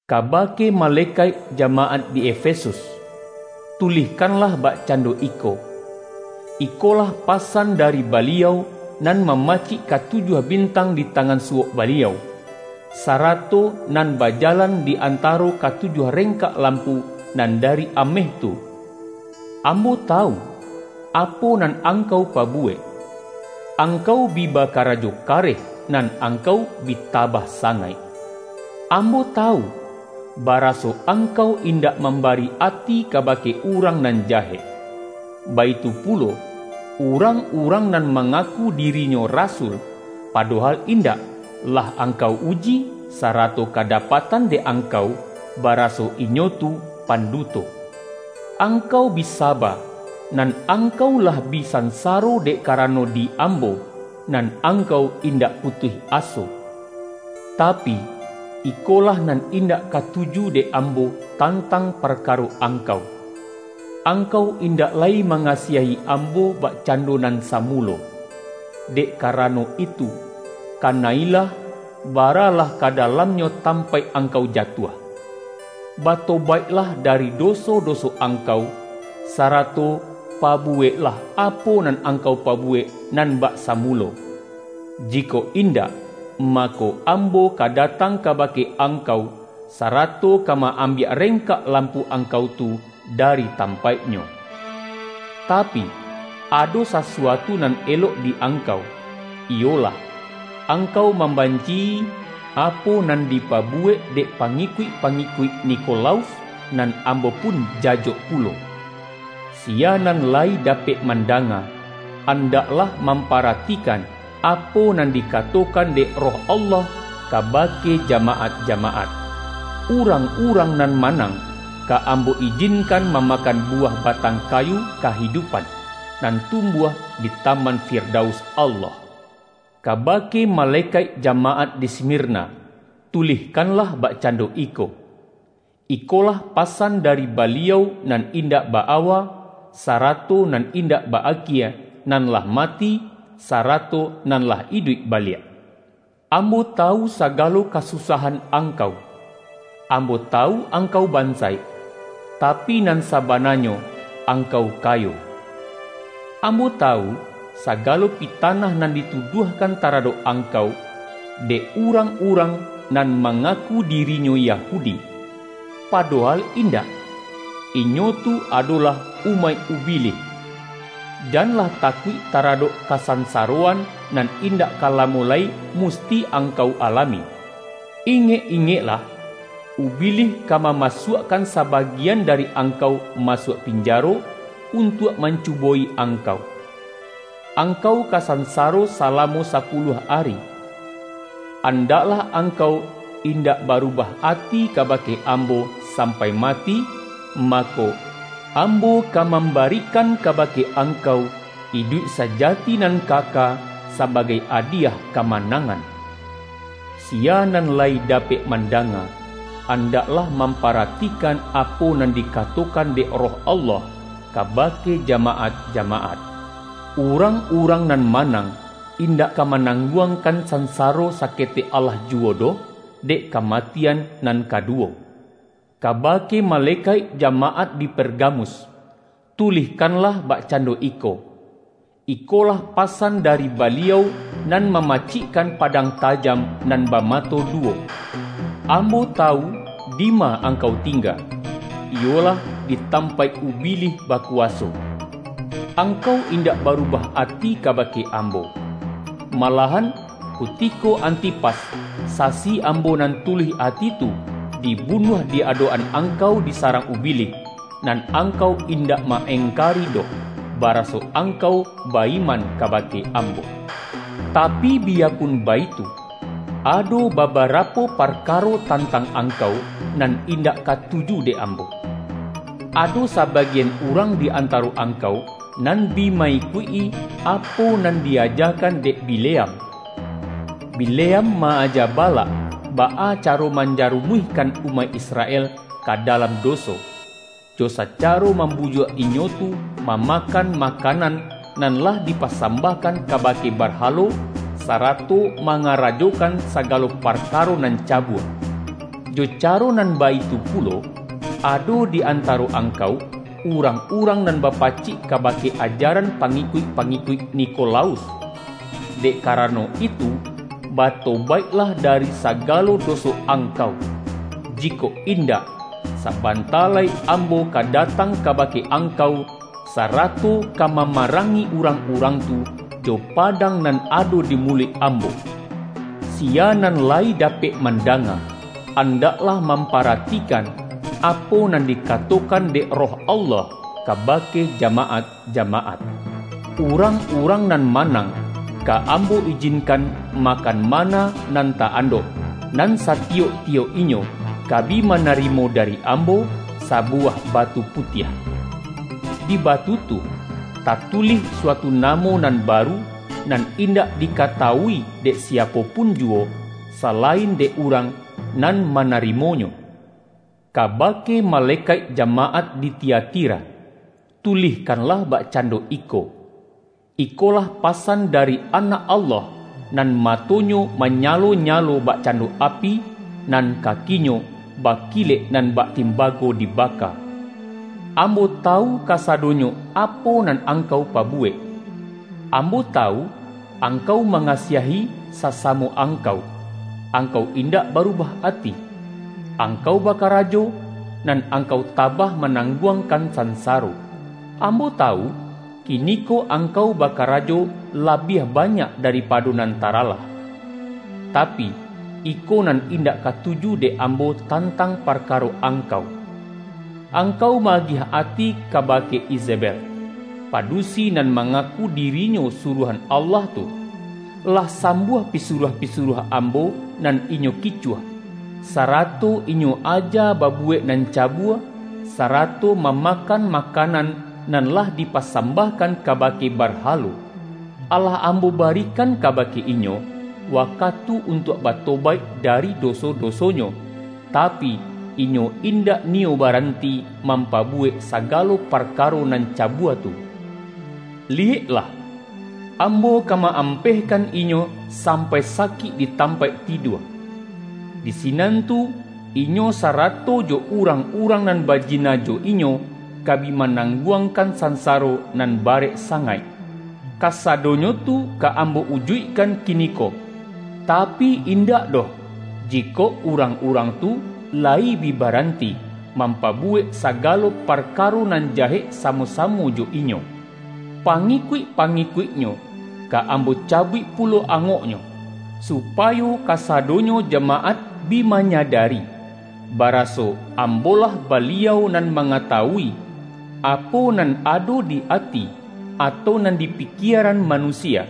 ”Kabake malekaik jamaat di Efesus, tulihkanlah bakcando iko: Ikolah pasan dari Baliau, nan ma-macik katujuah bintang di tangan suwok Baliau, sarato nan bajalan di antaro katujuah rengkak lampu nan dari ameh tu. Ambo tawu, apo nan angkau pabuwek: Angkau bi bakarajo kareh, nan angkau bi tabah sangaik. Ambo tawu, baraso angkau indak mambari ati kabake urang nan jahek. Baitu pulo, urang-urang nan mangaku dirinyo rasul, padohal indak, lah angkau uji, sa-rato kadapatan dek angkau, bara-so inyo tu panduto. Angkau bi sa-ba, nan angkau lah bi sansaro dek karano di Ambo, nan angkau indak putuih aso. Tapi, ikolah nan indak katuju dek Ambo tantang parkaro angkau: Angkau indak lai manga-siahi Ambo bakcando nan samulo. Dek karano itu, kana-ilah, baralah ka dalamnyo tampaik angkau jatuah! Batobaiklah dari doso-doso angkau, sarato pabuweklah apo nan angkau pabuwek nan bak samulo. Jikok in-dak, mako, Ambo ka datang kabake angkau, sarato ka ma-ambiak reng-kak lampu angkau tu dari tampaik-nyo. Tapi, ado sasuatu nan elok di angkau, iyolah: Angkau mamban-ci-i apo nan dipabuwek dek pangi-kuik-pangikuik Nikolaus, nan Ambo pun jajok pulo. Siya nan lai dapek mandanga, an-daklah mamparatikan, apo nan dika-tokan dek Roh Allah kabake jamaat-jamaat! Urang-urang nan manang, ka Ambo ijinkan mamakan buwah batang kayu kahidupan, nan tumbuah di Ta-man Firdaus Allah.” ”Kabake malekaik jamaat di Smir-na, tulihkanlah bakcando iko: Iko-lah pasan dari Baliau nan indak ba-awa, sarato nan indak ba-akie nan lah mati, sarato nan lah iduik baliak. Ambo tawu sagalo kasusahan ang-kau; Ambo tawu angkau bansaik — tapi, nan sabananyo angkau kayo! Ambo tawu, sagalo pitanah nan ditu-duahkan taradok angkau, dek urang-urang nan mangaku dirinyo Yahudi, padohal indak; inyo tu adolah umaik Ubilih! Janlah takuik taradok ka-sansaroan, nan indak ka lamo lai mus-ti angkau alami. Ingek-ingeklah, Ubi-lih ka mamasuakkan sabagian dari angkau masuak pinjaro, untuak man-cubo-i angkau. Angkau ka sansaro sa-lamo sapuluah ari. Andaklah angkau indak barubah ati kabake Ambo sam-pai mati, mako, Ambo ka mambari-kan kabake angkau iduik sajati nan kaka, sabagai adiyah kamanangan. Siya nan lai dapek mandanga, an-daklah mamparatikan apo nan dika-tokan dek Roh Allah, kabake jama-at-jamaat! Urang-urang nan manang, indak ka manangguangkan sansaro saketek alah juwo doh, dek kamatian nan ka-duwo.” ”Kabake malekaik jamaat di Per-gamus, tulihkanlah bakcando iko: Ikolah pasan dari Baliau nan ma-macikkan padang tajam, nan bama-to duwo. Ambo tawu dima angkau tingga, iyolah di tampaik Ubilih ba-kuwaso. Angkau indak barubah ati kabake Ambo. Malahan kutiko Anti-pas, sasi Ambo nan tuluih ati tu, di-bunuah di adok-an angkau di sarang Ubilih, nan angkau indak ma-engka-ri doh, baraso angkau ba-iman kaba-ke Ambo. Tapi, biyapun baitu, ado babarapo parkaro tantang angkau, nan indak katuju dek Ambo: Ado sa-bagian urang di antaro angkau, nan bi ma-ikuik-i apo nan di-ajakan dek Bi-leam. Bileam ma-aja Balak, baa caro manjarumuihkan umaik Israel ka da-lam doso; jo sacaro mambujuak inyo tu mamakan makanan, nan lah di-pasambahkan kabake barhalo, sara-to mangarajokan sagalo parkaro nan cabua. Jo caro nan baitu pulo, ado di antaro angkau, urang-urang nan bapacik kabake ajaran pangikuik-pa-ngikuik Nikolaus. Dek karano itu, batobaiklah dari sagalo doso angkau! Jikok indak, sabanta lai Ambo ka da-tang kabake angkau, sarato ka mama-rangi urang-urang tu, jo padang nan ado di muluik Ambo. Siya nan lai dapek mandanga, an-daklah mamparatikan, apo nan dika-tokan dek Roh Allah, kabake jama-at-jamaat! Urang-urang nan manang, ka Ambo ijinkan makan manna nan ta-andok, nan satiyok-tiyok inyo ka bi manari-mo dari Ambo, sabuwah batu putiah. Di batu tu, tatulih suatu namo nan baru, nan indak dikatawui dek siapo pun juwo, salain dek urang nan ma-narimonyo.” ”Kabake malekaik jamaat di Tia-tira, tulihkanlah bakcando iko: Ikolah pasan dari Anak Allah, nan mato-Nyo manyalo-nyalo bakcando api, nan kaki-Nyo bakilek nan bak timbago dibaka. Ambo tawu ka-sadonyo apo nan angkau pabuwek — Ambo tawu, angkau mangasiahi sa-samo angkau, angkau indak barubah ati, angkau bakarajo, nan angkau ta-bah manangguangkan sansaro. Ambo tawu, kiniko angkau bakarajo labiah banyak daripado nan taralah. Ta-pi, iko nan indak katuju dek Ambo tantang parkaro angkau: Angkau ma-agiah ati kabake Izebel, padusi nan mangaku dirinyo suruahan Allah tu. Lah sambuah pisuruah-pisuruah Am-bo nan inyo kicuah, sarato inyo aja babuwek nan cabua, sarato mamakan makanan, nan lah dipasambahkan ka-bake barhalo. Alah Ambo barikan kabake inyo, wakatu untuak bato-baik dari doso-dosonyo, tapi, inyo in-dak niyo baranti mampabuwek saga-lo parkaro nan cabua tu. Liyeklah! Ambo ka ma-ampehkan inyo sampai sakik di tampaik tidua. Di sinan tu, inyo sarato jo urang-urang nan bajina jo inyo, ka bi manangguangkan san-saro nan barek sangaik. Kasadonyo tu ka Ambo ujuikkan kiniko tapi, indak doh jikok urang-urang tu layi bi baranti, mampabuwek sagalo par-karo nan jahek samo-samo jo inyo. Pangikuik-pangikuiknyo ka Ambo cabuik pulo angoknyo, supayo kasa-donyo jamaat bi manyadari, baraso Ambo-lah Baliau nan mangatawui, apo nan ado di ati, atau nan di pikie-ran manusia.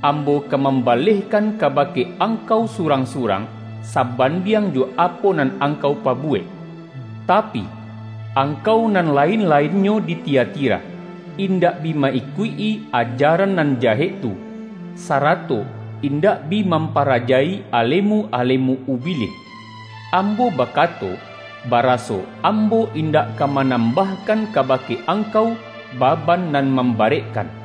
Ambo ka mambalehkan kabake angkau surang-surang, saban-diang jo apo nan angkau pabuwek. Tapi, angkau nan lain-lainnyo di Tiatira, indak bi ma-ikuik-i ajaran nan jahek tu, sarato indak bi mampa-raja-i alemu-alemu Ubilih. Ambo ba-kato, baraso Ambo indak ka manam-bahkan kabake angkau, baban nan mambarekkan.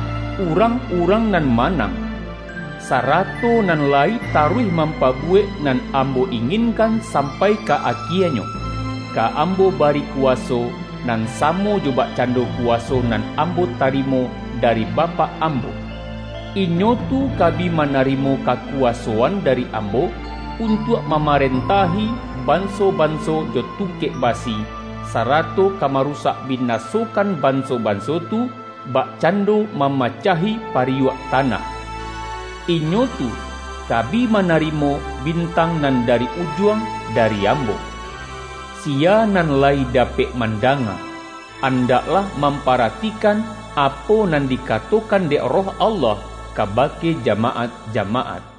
Urang-urang nan manang, sarato nan layi ta-ruih mampabuwek nan Ambo inginkan sampai ka akienyo, ka Ambo bari kuwaso, nan samo jo bakcando kuwa-so nan Ambo tarimo dari Bapak Am-bo. Inyo tu ka bi manarimo kakuwa-soan dari Ambo, untuak mamarentahi banso-banso jo tungkek basi, sarato ka marusak binasokan banso-banso tu, bakcando mamacahi pariyuak ta-nah. Inyo tu ka bi manarimo Bin-tang Nan Dari Ujuang dari Ambo. Siya nan layi dapek mandanga, andaklah mamparatikan, apo nan di-katokan dek Roh Allah kabake jama-at-jamaat!”